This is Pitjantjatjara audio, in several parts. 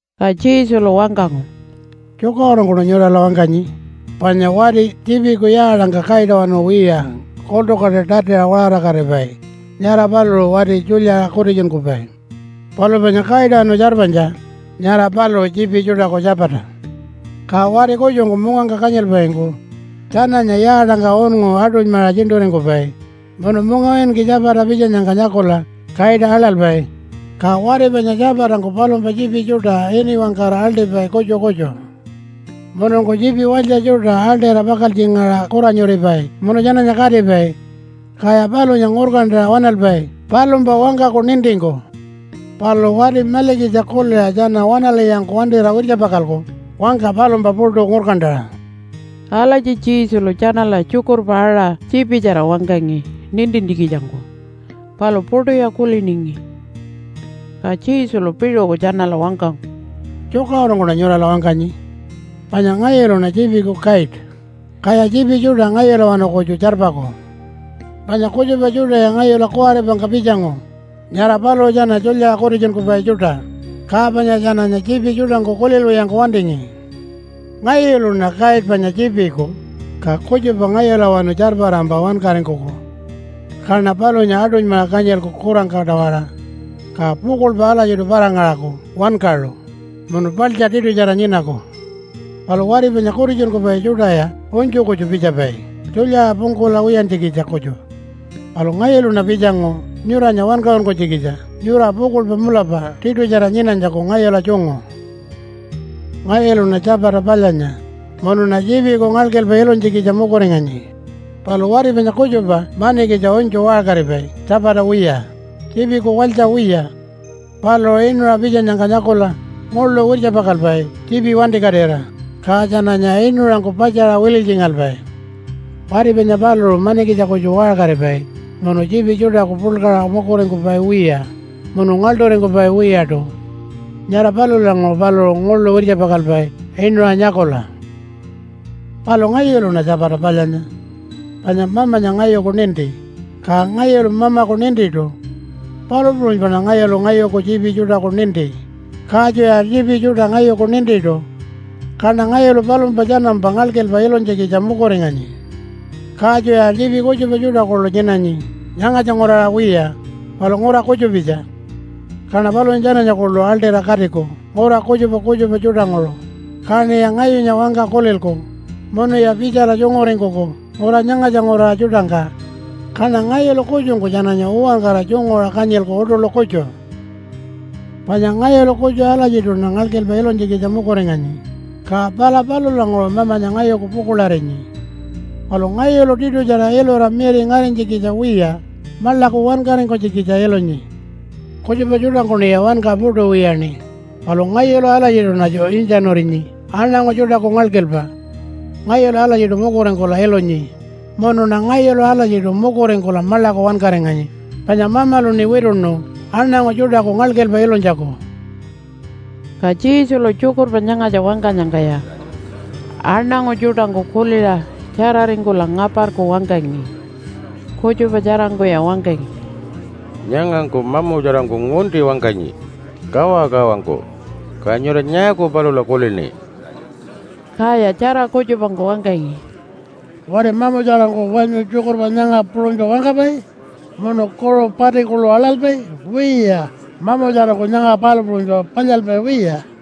Ka Jesulu wangkangu, “Tjukaṟurungkuṉa nyurala wangkanyi, panya wati tjiipiku yaatangka kaitawanu wiya kultukaṯa tatiṟa waṟarakatipai, nyara paluṟu wati tjulyaṟa kutitjunkupai. Palu panya kaitawanu tjarpanytja, nyara paluṟu tjiipi tjuṯaku tjapata. Ka wati kutjungku mungangka kanyilpaingku tjananya yaatangka unngu aṯunymaṟa tjiṉṯuringkupai, munu mungawinki tjapata pitjanyangka nyakula kaita aḻalpai. Ka wati panya tjapatangku palumpa tjiipi tjuṯa ini wangkara aḻṯipai kutju kutju. Mununku tjiipi walytja tjuṯa aḻṯira pakaltjingaṟa kuranyuripai munu tjananya katipai. Kaya palunya ngurkantaṟa waṉalpai palumpa wangkaku nintingku. Palu wati malikitja kuliṟa tjana waṉalwiyangku wantira wirtjapakalku wangka palumpa puṯu ngurkantaṟa.” Alatji Jesulu tjanala tjukurpa aṟa tjiipitjara wangkangi nintintjikitjangku, palu puṯuya kuliningi. Ka Jesulu piṟuku tjanala wangkangu, “Tjukaṟurungkuṉa nyurala wangkanyi. Panya ngayuluṉa tjiipiku kaita, kaya tjiipi tjuṯa ngayulawanu kutju tjarpaku. Panya kutjupa tjuṯaya ngayula kuwaripangka pitjangu, nyara paluṟu tjana tjulyaṟa kutitjunkupai tjuṯa, ka panya tjananya tjiipi tjuṯangku kulilwiyangku wantingi. Ngayuluṉa kaita panya tjiipiku, ka kutjupa ngayulawanu tjarparampa wankaringkuku. Kaṉa palunya aṯunymaṟa kanyilku kurangka-tawara. Ka pukuḻpa alatjiṯu para-ngaṟaku wankaṟu munu paḻtja tiṯutjara nyinaku. Palu wati panya kutitjunkupai tjuṯaya unytju kutju pitjapai tjulyaṟa pungkula wiyantjikitja kutju. Palu ngayuluṉa pitjangu nyuranya wankaṟunkunytjikitja nyura pukuḻpa mulapa tiṯutjara nyinanytjaku ngayula tjungu. “Ngayuluṉa tjapata palyanya, munuṉa tjiipiku ngalkilpa ilunytjikitja mukuringanyi. Palu wati panya kutjupa manikitja unytju waṟkaripai tjapata wiya, tjiipiku walytja wiya. Paluṟu inuṟa pitjanyangka nyakula nguḻu wirtjapakalpai tjiipi wantikatira, ka tjananya inuṟangku patjaṟa wililytjingalpai. Wati panya paluṟu manikitja kutju waṟkaripai munu tjiipi tjuṯaku puḻkaṟa mukuringkupai wiya munu ngaḻṯuringkupai wiyaṯu. Nyara palulanguṟu paluṟu nguḻu wirtjapakalpai inuṟa nyakula. “Palu ngayuluṉa tjapata palyanya. Panya Mamanya ngayuku ninti, ka ngayulu Mamaku nintiṯu. Palu puṟunypaṉa ngayulu ngayuku tjiipi tjuṯaku ninti, katjuya tjiipi tjuṯa ngayuku nintiṯu. Kaṉa ngayulu palumpa tjanampa ngalkilpa ilunytjikitja mukuringanyi. Katjuya tjiipi kutjupa tjuṯa kuḻu nyinanyi nyangatja nguraṟa wiya, palu ngura kutjupitja. Kaṉa palunya tjananya kuḻu aḻṯira katiku ngura kutjupa kutjupa tjuṯanguṟu, kaṉiya ngayunya wangka kulilku munuya pitjala tjunguringkuku ngura nyangatja nguraṟa tjuṯangka. Kaṉa ngayulu kutjungku tjananya uwankara tjunguṟa kanyilku uṯuḻu kutju. “Panya ngayulu kutju alatjiṯuṉa ngalkilpa ilunytjikitja mukuringanyi, ka pala palulanguṟu Mamanya ngayuku pukuḻarinyi. Palu ngayulu tiṯutjara ilura miri ngarinytjikitja wiya, maḻaku wankaringkunytjikitja ilunyi. Kutjupa tjuṯangkuṉiya wanka puṯu wiyaṉi, palu ngayulu alatjiṯuṉatju intjanurinyi aṉangu tjuṯaku ngalkilpa. Ngayulu alatjiṯu mukuringkula ilunyi, munuṉa ngayulu alatjiṯu mukuringkula maḻaku wankaringanyi, panya Mamaluṉi wituṉu aṉangu tjuṯaku ngalkilpa ilunytjaku.” Ka Jesulu tjukurpa nyangatja wangkanyangkaya aṉangu tjuṯangku kuliṟa tjararingkula ngaparku wangkangi. Kutjupa tjarangkuya wangkangi, “Nyangangku mamutjarangku ngunti wangkanyi, kawakawangku. Ka nyura nyaaku palula kulini?” Kaya tjara kutjupangku wangkangi, “Wati mamutjarangku wanyu tjukurpa nyanga puṟunypa wangkapai, munu kuṟu pati kuḻu aḻalpai? Wiya, mamutjarangku nyanga palu puṟunypa palyalpai wiya.”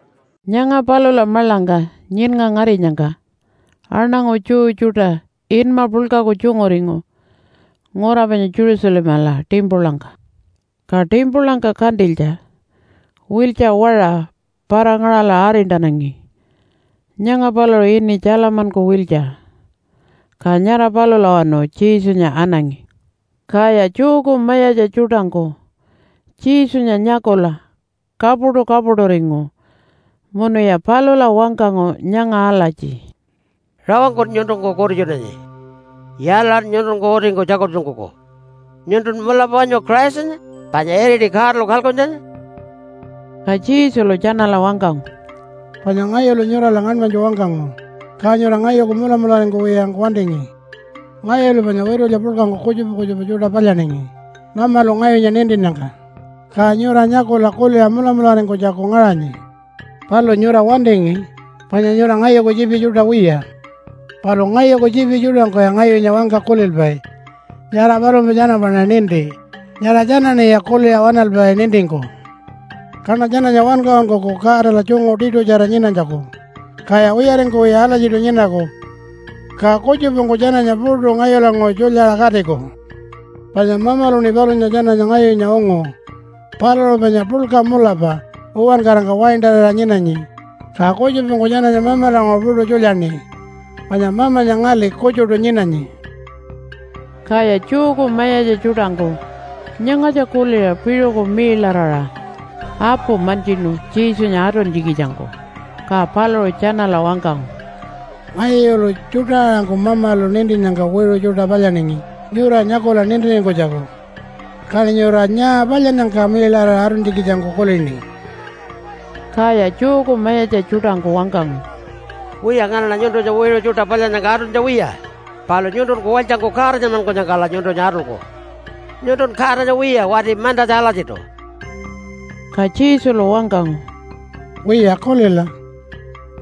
Nyanga palula maḻangka nyiṉnga ngarinyangka, aṉangu Jew tjuṯa inma puḻkaku tjunguringu ngura panya Jerusalemala timpulangka. Ka timpulangka kantilytja wiltja waṟa para-ngaṟala arintanangi. Nyanga paluṟu ini Tjalamanku wiltja. Ka nyara palulawanu Jesunya anangi. Kaya Jewku mayatja tjuṯangku Jesunya nyakula kapuṯu-kapuṯuringu munuya palula wangkangu nyanga alatji, “Rawangkun nyuntunku kutitjunanyi. Yaalaṟan nyuntunku utingku tjakultjunkuku? Nyuntun mulapa wanyu Christanya panya iriti Godalu kalkuntjanya?” Ka Jesulu tjanala wangkangu, “Panya ngayulu nyurala ngaṉmanytju wangkangu, ka nyura ngayuku mulamularingkuwiyangku wantingi. Ngayulu panya witulya puḻkangku kutjupa kutjupa tjuṯa palyaningi Mamalu ngayunya nintinnyangka, ka nyura nyakula kuliṟa mulamularingkunytjaku ngaṟanyi. Palu nyura wantingi, panya nyura ngayuku tjiipi tjuṯa wiya. Palu ngayuku tjiipi tjuṯangku ngayunya wangka kulilpai. Nyara palumpa tjanampaṉa ninti. Nyara tjanaṉiya kuliṟa waṉalpai nintingku. Kaṉa tjananya wankaṟunkuku Godala tjungu tiṯutjara nyinanytjaku, kaya wiyaringkuwiya alatjiṯu nyinaku. Ka kutjupangku tjananya puṯu ngayulanguṟu tjulyaṟa katiku. Panya Mamaluṉi palunya tjananya ngayunya ungu. Paluṟu panya puḻka mulapa uwankarangka waintarira nyinanyi, ka kutjupangku tjananya Mamalanguṟu puṯu tjulyaṉi. Panya Mamanya ngali kutjuṯu nyinanyi.” Kaya Jewku mayatja tjuṯangku nyangatja kuliṟa piṟuku miiḻaraṟa apu mantjinu Jesunya atuntjikitjangku. Ka paluṟu tjanala wangkangu, “Ngayulu tjuṯa-aṟangku Mamalu nintinnyangka wiṟu tjuṯa palyaningi nyura nyakula nintiringkunytjaku. Kaṉi nyura nyaa palyannyangka miiḻaraṟa atuntjikitjangku kulini?” Kaya Jewku mayatja tjuṯangku wangkangu, “Wiya, nganaṉa nyuntunya wiṟu tjuṯa palyannyangka atuntja wiya, palu nyuntunku walytjangku Godanmankunyangkala nyuntunya atulku. Nyuntun Godanya wiya, wati mantatja alatjiṯu.” Ka Jesulu wangkangu, “Wiya kulila!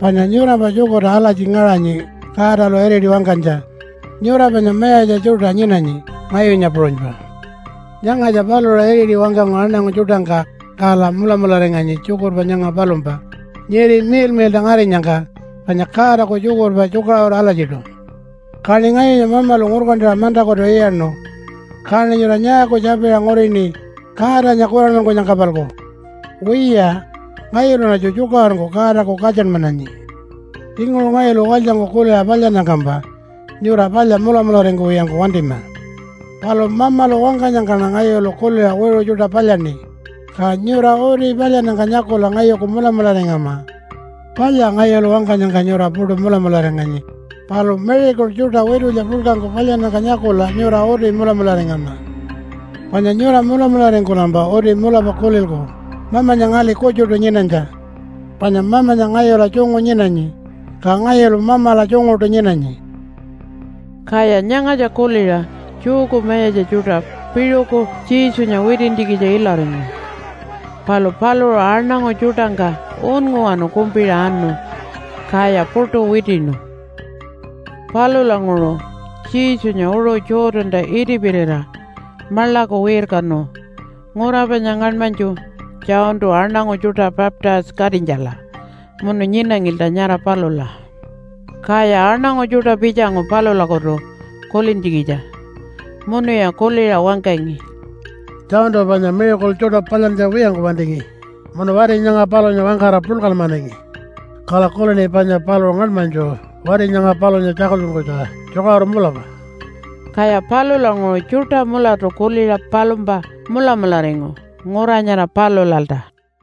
Panya nyurampa tjukurta alatji ngaṟanyi Godalu iriti wangkanytja, ‘Nyura panya mayatja tjuṯa nyinanyi ngayunya puṟunypa.’ Nyangatja paluṟu iriti wangkangu aṉangu tjuṯangka, kala mulamularinganyi tjukurpa nyanga palumpa nyiri miḻmiḻṯa ngarinyangka, panya Godaku tjukurpa tjukaṟuru alatjiṯu. Kaṉi ngayunya Mamalu ngurkantaṟa mantakutu iyaṉu. Kaṉi nyura nyaaku tjapiṟa ngurini Godanya kuranmankunyangka-palku? Wiya, ngayuluṉatju tjukaṟurungku Godaku katjanmananyi. Tjinguṟu ngayulu walytjangku kuliṟa palyannyangkampa nyura palya mulamularingkuwiyangku wantima. Palu Mamalu wangkanyangkaṉa ngayulu kuliṟa wiṟu tjuṯa palyaṉi, ka nyura uti palyannyangka nyakula ngayuku mulamularingama. Palya ngayulu wangkanyangka nyura puṯu mulamularinganyi, palu miracle tjuṯa witulya puḻkangku palyannyangka nyakula nyura uti mulamularingama. Panya nyura mulamularingkulampa uti mulapa kulilku Mamanya ngali kutjuṯu nyinanytja. Panya Mamanya ngayula tjungu nyinanyi, ka ngayulu Mamala tjunguṯu nyinanyi.” Kaya nyangatja kuliṟa Jewku mayatja tjuṯa piṟuku Jesunya witintjikitja ilaringu. Palu paluṟu aṉangu tjuṯangka unnguwanu kumpiṟa anu, kaya puṯu witiṉu. Palulanguṟu Jesunya uṟu Jordanta itipirira maḻaku wirkanu ngura panya ngaṉmanytju Johntu aṉangu tjuṯa baptise-katinytjala, munu nyinangilta nyara palula. Kaya aṉangu tjuṯa pitjangu palulakutu kulintjikitja. Munuya kuliṟa wangkangi, “Johntu panya miracle tjuṯa palyantja wiyangku wantingi munu wati nyanga palunya wangkara puḻkanmanangi. Kala kulini panya paluṟu ngaṉmanytju wati nyanga palunya tjakultjunkunytja tjukaṟuru mulapa.” Kaya palulanguṟu tjuṯa mulatu kuliṟa palumpa mulamularingu ngura nyara palulalta.